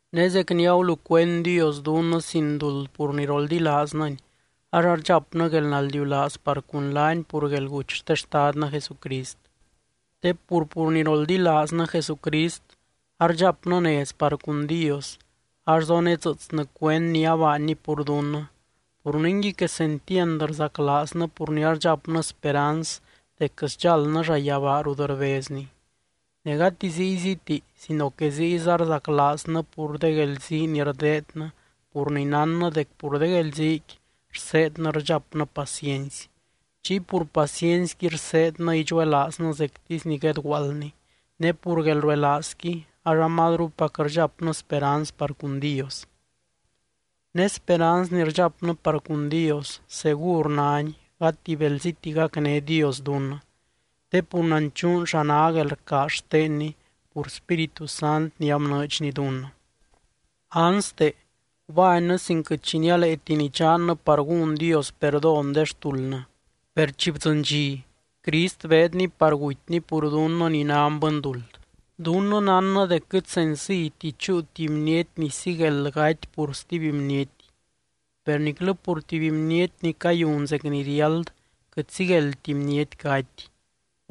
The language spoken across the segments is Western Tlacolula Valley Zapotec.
Ne zec ni agulucuend Dios dunnɨ sin duld pur ni roldilaaznɨny ax ardxapnɨ guelnaldiulaaz par cun laany pur guelguty xte Xtadnɨ Jesucrist. Te pur, pur ni roldilaaznɨ Jesucrist ardxapnɨ nez par cun Dios ax zonedzɨɨtsnɨ cuend ni abaanny pur dunnɨ, pur ningui, quesentiand rzaclaaznɨ pur ni rdxapnɨ speranz dec sdxáldnɨ llayabaa rut rbezny. Ne gati zíyziti sino que ziyza rzaclaaznɨ pur de guelzii ni rdeednɨ pur ni nánnɨ dec pur de guelziiqui rseednɨ idxapnɨ paciency. Chiy pur paciencyqui rseednɨ idxuelaaznɨ zectisy ni guedguaaldni, ne pur guelruelaazqui ax amazrupac rdxapnɨ speranz par cun Dios. Ne speranz ni rdxapnɨ par cun Dios segur náni gati belziti gacné Dios dunnɨ, te pur nanchuun xa ná guelrcaaz xtenny pur Spíritu Sant ni abnɨɨdxny dunnɨ. Anste, gubánnɨ sin quɨt xi nialeeti nidxannɨ par gún Dios perdón de xtuldnɨ. Per chi bdzɨny dxi, Crist beedny par gutyny pur dunnɨ ni nan bɨnduld. Dunnɨ nánnɨ dec quɨt senciyti chúu tuby bniety ni sigueld gaty pur stuby bniety. Per niclɨ pur tuby bniety ni cayun zec ni riáld quɨt sigueldti bniety gaty,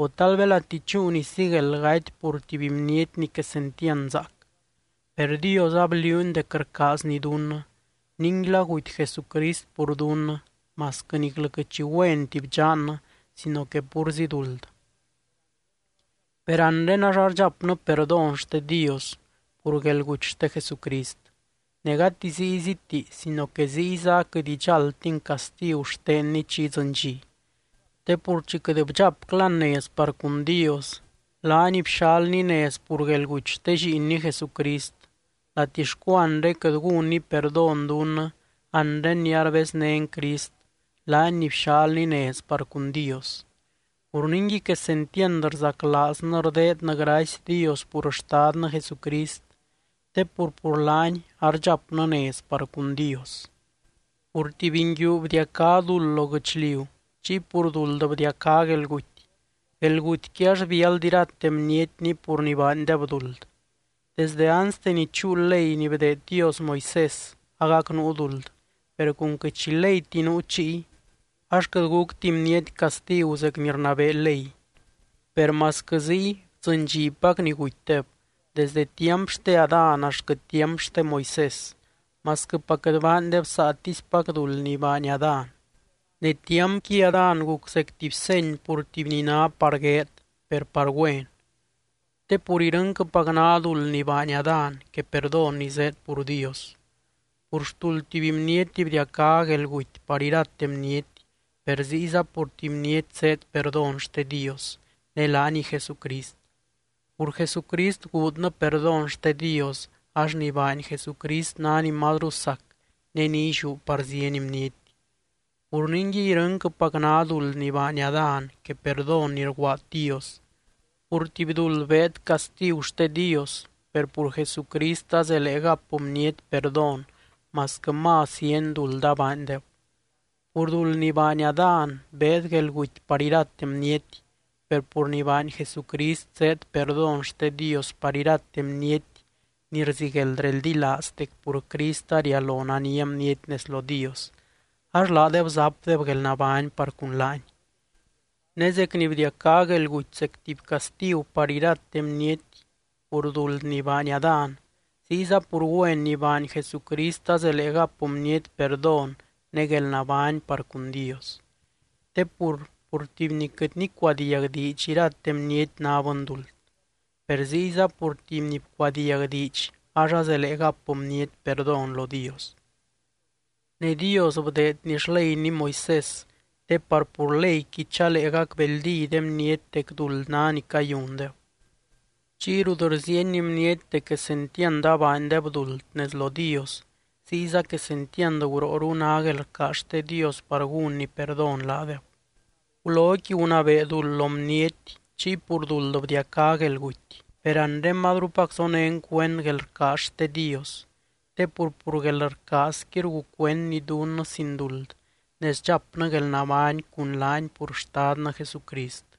o tal belati chúu ni sigueld gaty pur tuby bniety ni quesentiand zaac. Per Dios abliuuny dec rcaazny dunnɨ, ninguila guty Jesucrist pur dunnɨ, masquɨ niclɨ quɨt xi güenti bdxannɨ sino que púrzi duld. Per anre ax ardxapnɨ perdón xte Dios pur guelguty xte Jesucrist, ne gati zíyziti sino que ziyza aquɨt idxáldtin castigu xtenny chi idzɨny dxi. Te pur chi quɨt bdxapclan nez par cun Dios, laany bxalny nez pur guelguty xte Lliinny Jesucrist, latixcu anre quɨt gúnny perdón dunnɨ anre ni arbeznén Crist, laany ni bxalny nez par cun Dios. Pur ningui quesentiand rzaclaaznɨ rdeednɨ gracy Dios pur Xtadnɨ Jesucrist te pur, pur laany ardxapnɨ nez par cun Dios. Pur tuby nguiu bdiacá duld lo guɨchliu chiy pur duld bdiacá guelguty, guelgutyqui ax biáld irate bnietni pur ni baandeb duld. Desdɨ anste ni chúu ley ni bdeed Dios Moisés agac nuu duld, per cun quɨt xi leyti nuu chiy, ax quɨt gucti bniety castigu zec ni rnabee ley. Per masquɨ ziy bdzɨndxipac ni gutydeb, desde tiamp xte Adán axtquɨ tiamp xte Moisés, masquɨpac quɨt baandeb saatispac duld ni baany Adán. Ne tiampqui Adán guc zec tuby seny pur tuby ni ná par gueed, per par güen. Te pur irɨnquɨpac ná duld ni baany Adán que perdón ni zéed pur Dios. Pur xtuld tuby bniety bdiacá guelguty par irate bniety, per ziyza pur tuby bniety zéed perdón xte Dios, ne laaniy Jesucrist. Pur Jesucrist guudnɨ perdón xte Dios ax ni baany Jesucrist ná ni mazru sac ne ni illiú par zieny bniety. Pur ningui irɨnquɨpac ná duld ni baany Adán que perdón ni rguaad Dios. Pur tuby duld beed castigu xte Dios, per pur Jesucrist azelee gap bniety perdón masquɨ más zieny duld abaandeb. Pur duld ni baany Adán beed guelguty par irate bniety. Per pur ni baany Jesucrist zéed perdón xte Dios par irate bniety ni rzigueld reldilaaz dec pur Crist arialo nania bniety nez lo Dios, ax laadeb zapdeb guelnabány par cun laany. Ne zec ni bdiacá guelguty zec tuby castigu par irate bniety pur duld ni baany Adán, ziyza pur güen ni baany Jesucrist azelee gap bniety perdón ne guelnabány par cun Dios. Te pur, pur tuby ni quɨt nicuadiag diidx irate bniety ná bɨnduld. Per ziyza pur tuby ni bcuadiag diidx ax azelee gap bniety perdón lo Dios. Ne Dios bdeedny xleyny Moisés te par pur leyqui chalee gacbeldí de bniety dec duld ná ni cayundeb. Chiy rut rziieny bniety dec quesentiand abaandeb duld nez lo Dios, ziyza quesentiand gurooru ná guelrcaaz xte Dios par gúnny perdón laadeb. Guloqui gunabee duld lo bniety, chiy pur duld bdiacá guelguty. Per anre mazrupac zonén cuend guelrcaaz xte Dios te pur, pur guelrcaazqui rgucuendny dunnɨ sin duld ne sdxapnɨ guelnabány cun laany pur Xtadnɨ Jesucrist.